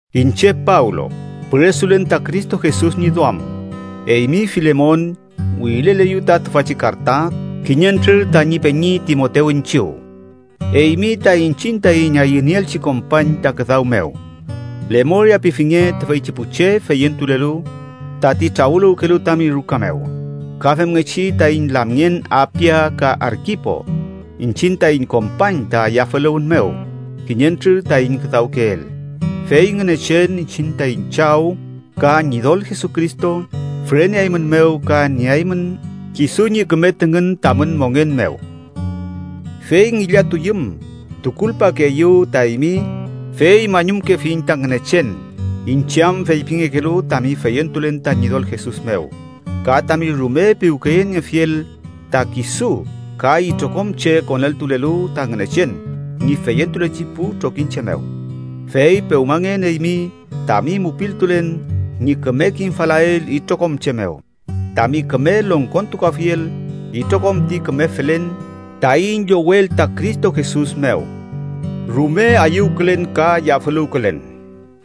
Iñche Pablo, püresulen ta Cristo Jesus ñi duam. Eymi Filemon wirileleyu ta tüfachi karta kiñentrür tañi peñi Timotew iñchiw. Eymi ta iñchiñ taiñ ayünieelchi kompañ ta küdaw mew. Lemoria pifinge tüfeychi pu che feyentulelu tati trawüluwkelu tami ruka mew, ka femngechi taiñ lamngen Apia ka Arkipo, iñchiñ taiñ kompañ ta yafüluwün mew kiñentrür taiñ küdawkeel. Fey Ngünechen iñchiñ taiñ Chaw ka Ñidol Jesucristo füreneaeymünmew ka nieaymün kisu ñi küme tüngün tamün mongen mew. Fey ngillatuyüm, tukulpakeeyu ta eymi, fey mañumkefiñ ta Ngünechen, iñche am feypingekelu tami feyentulen ta Ñidol Jesus mew, ka tami rume piwkeyeniefiel ta kisu ka itrokom che koneltulelu ta Ngünechen ñi feyentulechi pu trokiñche mew. Fey pewmangen eymi tami mupiltulen ñi küme kimfalael itrokom che mew, tami küme longkontukuafiel itrokom ti küme felen taiñ llowel ta Cristo Jesus mew. Rume ayüwkülen ka yafüluwkülen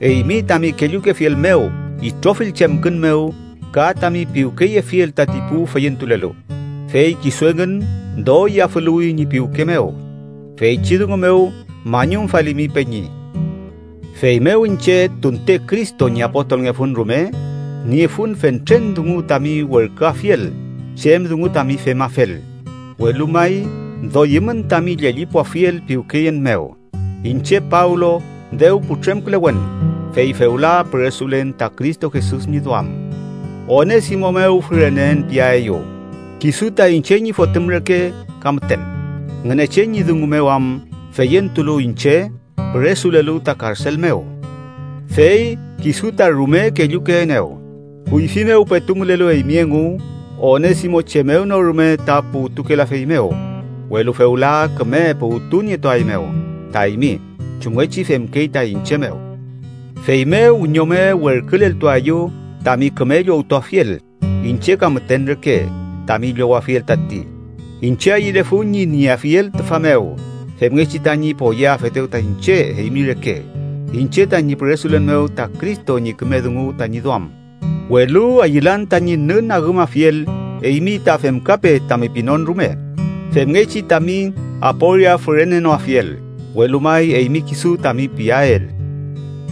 eymi tami kellukefiel mew itrofill chemkün mew ka tami piwkeyefiel tati pu feyentulelu, fey kisu engün doy yafüluwi ñi piwke mew. Feychi dungu mew mañumfalimi, peñi. Feymew iñche, tunte Cristo ñi apostolngefun rume, niefun fentren dungu tami werküafiel chem dungu tami femafel, welu may doyümün tami llellipuafiel piwkeyen mew. Iñche Pablo dew putremkülewen, fey fewla püresulen ta Cristo Jesus ñi duam, Onesimo mew füreneen piaeyu. Kisu ta iñche ñi fotüm reke ka müten Ngünechen ñi dungu mew am feyentulu iñche püresulelu ta karsel mew, fey kisu ta rume kellukeenew. Kuyfi mew petu mülelu eymi engu, Onesimo chem mew no rume ta puwtukelafeymew, welu fewla küme puwtunietuaeymew ta eymi chumngechi femkey ta iñche mew. Feymew wiñome werküleltuaeyu tami küme llowtuafiel iñche ka müten reke tami llowafiel tati. Iñche ayülefun ñi nieafiel tüfa mew femngechi tañi poyeafetew ta iñche eymi reke, iñche tañi püresulen mew ta Cristo ñi küme dungu tañi duam. Welu ayülan tañi nünagümafiel eymi ta femkape tami pinon rume, femngechi tami aporia fürenenoafiel, welu may eymi kisu tami piael.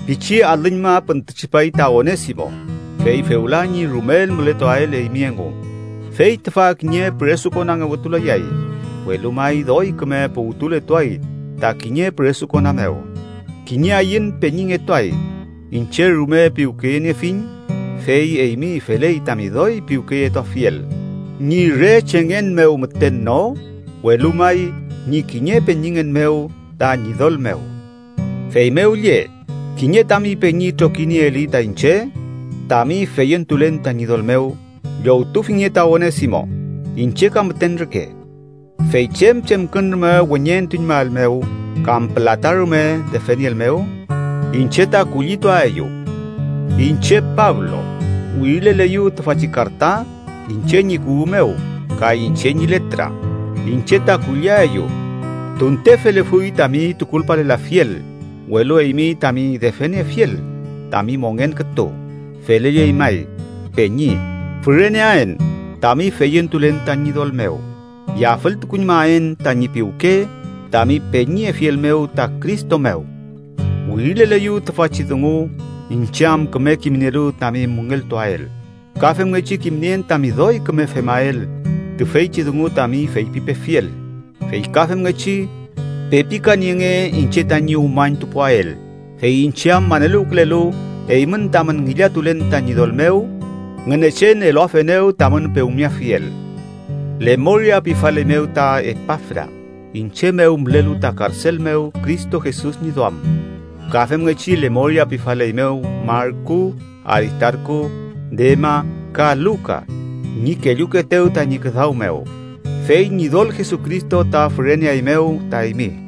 Pichi alüñma püntütripay ta Onesimo, fey fewla ñi rumel mületuael eymi engu. Fey tüfa kiñe püresukonangewetulayay, welu may doy küme puwtuletuay ta kiñe püresukona mew. Kiñe ayün peñingetuay. Iñche rume piwkeyeniefiñ, fey eymi feley tami doy piwkeyetuafiel, ñi re chengen mew müten no, welu may ñi kiñe peñingen mew ta Ñidol mew. Feymew lle, kiñe tami peñi trokinieeli ta iñche tami feyentulen ta Ñidol mew, llowtufinge ta Onesimo iñche ka müten reke, fey chem chemkün rume weñeentuñmaelmew, kam pülata rume defenieelmew, iñche ta kullituaeyu. Iñche, Pablo, wirileleyu tüfachi karta, iñche ñi kuwü mew ka iñche ñi letra: Iñche ta kulliaeyu. ¡Tunte felefuy tami tukulpalelafiel, welu eymi tami defeniefiel, tami mongen kütu! Felelley may, peñi, füreneaen tami feyentulen ta Ñidol mew. Yafültukuñmaen tañi piwke tami peñiyefiel mew ta Cristo mew. Wirileleyu tüfachi dungu iñche am küme kimnielu tami müngeltuael. Ka femngechi kimnien tami doy küme femael tüfeychi dungu tami feypipefiel. Fey ka femngechi, pepikanienge iñche tañi umañtupuael, fey iñche am maneluwkülelu eymün tamün ngillatulen ta Ñidol mew, Ngünechen eluafenew tamün pewmeafiel. Lemoria pifaleymew ta Epafra, iñche mew mülelu ta karsel mew Cristo Jesus ñi duam. Ka femngechi lemoria pifaleymew Marku, Aristarku, Dema ka Luka, ñi kellukeetew tañi küdaw mew. Fey Ñidol Jesucristo ta füreneaeymew ta eymi.